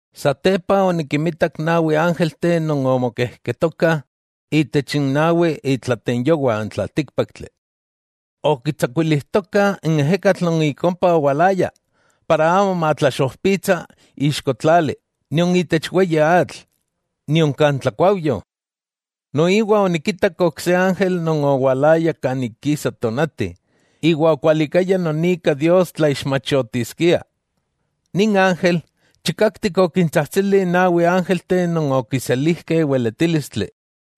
Satepa, onikinmitak nawi ángelteh non omokejketokah itech n nawi itlatenyowah n tlaltíkpaktli, okitsakuilijtokah n ejekatl non ik ompa owalaya, para amo matlaxojpitsa ixko tlali, nion itech weyi atl, nion kan tlakuaujyo. Noiwa onikitak ok se ángel non owalaya kan ik kisa tonati, iwa okualikaya non ika Dios tlaixmachotiskia. Nin ángel, chikaktik okintsajtsili n nawi ángelteh non okiselijkeh weletílistli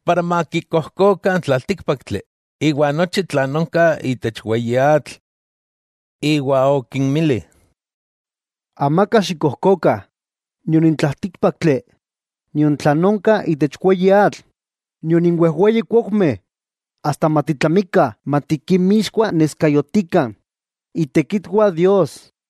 para makikojkokah n tlaltíkpaktli iwa nochi tlan onka itech weyi atl. Iwa okinmili: —¡Amaka xikkojkokah nion n tlaltíkpaktli, nion tlan onka itech weyi atl, nion n wejweyi kuaujmeh, asta matitlamikah matikinmixkuaneskayotikah itekitwah Dios!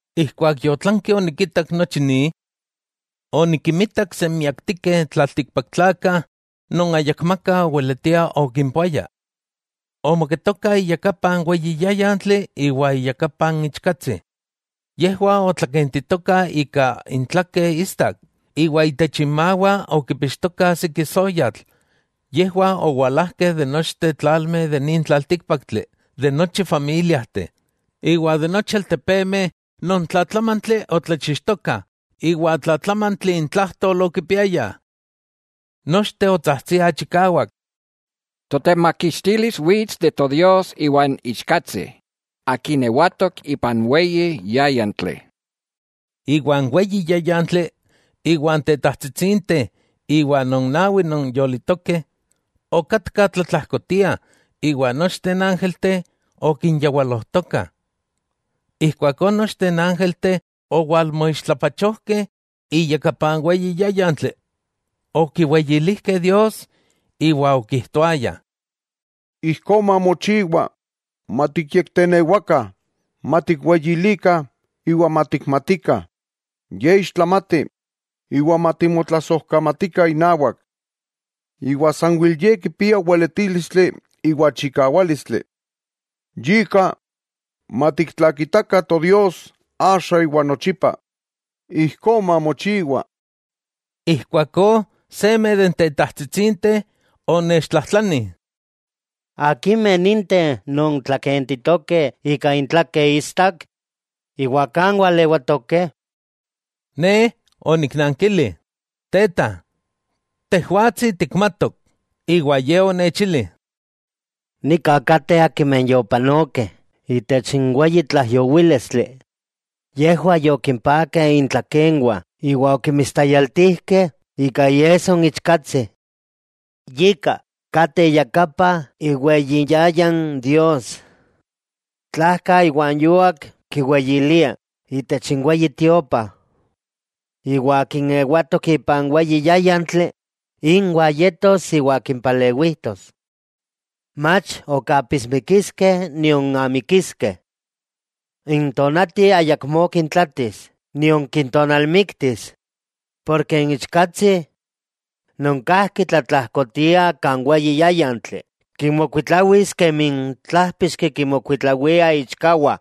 Ijkuak yotlanki onikitak nochi ni, onikinmitak senmiaktikeh tlaltikpaktlakah non ayakmaka oweletia okimpoaya, omoketokah iyakapa n weyi yáyantli iwa iyakapa n Ichkatsi. Yejwah otlakentitokah ika intlakeh istak, iwa itech inmawah okipixtokah siki soyatl; yejwah owalajkeh ik nochteh tlalmeh itech nin tlaltíkpaktli, de nochi familiajteh, iwa de nochi altepemeh non tlatlamantli otlachixtokah iwa tlatlamantli intlajtol okipiayah. Nochteh otsajtsiah chikawak: ¡Totemakixtilis wits de Todios iwa n Ichkatsi, Akin ewatok ipan weyi yáyantli! Iwa n weyi yáyantli iwa n tetajtsitsinteh iwa non nawi non yolitokeh, okatkah tlatlajkotiah, iwa nochteh n ángelteh okinyawalojtokah. Ijkuakó nochteh n ángelteh owalmoixtlapachojkeh iyakapa n weyi yáyantli. Okiweyilijkeh Dios iwa okijtoayah: ¡Ijkó mamochiwa! Matikyektenewakah, matikweyilikah, iwa matikmatikah Ye ixtlamati iwa matimotlasojkamatikah inawak, iwa sanwel Ye kipia weletílistli iwa chikawálistli. Yika, matiktlakitakah Todios axa iwa nochipa. ¡Ijkó mamochiwa! Ijkuakó seme de n tetajtsitsinteh onechtlajtlani: —¿Akimeh ninteh non tlakentitokeh ika intlakeh istak, iwa kan walewatokeh? Ne oniknankili: —Teta, tejwatsi tikmatok. Iwa Ye onechili: —Nika kateh akimeh yopanokeh itech n weyi tlaijyowílistli, yejwah yokimpakeh intlakenwah iwa okinmistayaltijkeh ika iesso n Ichkatsi. Yika, kateh iyakapa iweyi iyayan Dios, tlajka iwa n yuak kiweyiliah itech iweyitiopa; iwa akin ewatok ipan weyi yáyantli inwah yetos iwa kimpalewijtos. Mach ok apismikiskeh nion amikiskeh. N tonati ayakmó kintlatis nion kintonalmiktis porke n Ichkatsi, non kajki tlatlajkotiah kan weyi yáyantli, kinmokuitlawis kemi n tlájpixki kinmokuitlawia iichkawah,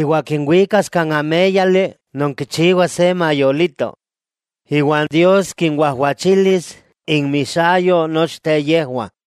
iwa kinwikas kan améyali non kichiwa se mayolito; iwa Dios kinwajwachilis inmixayo nochteh yejwah.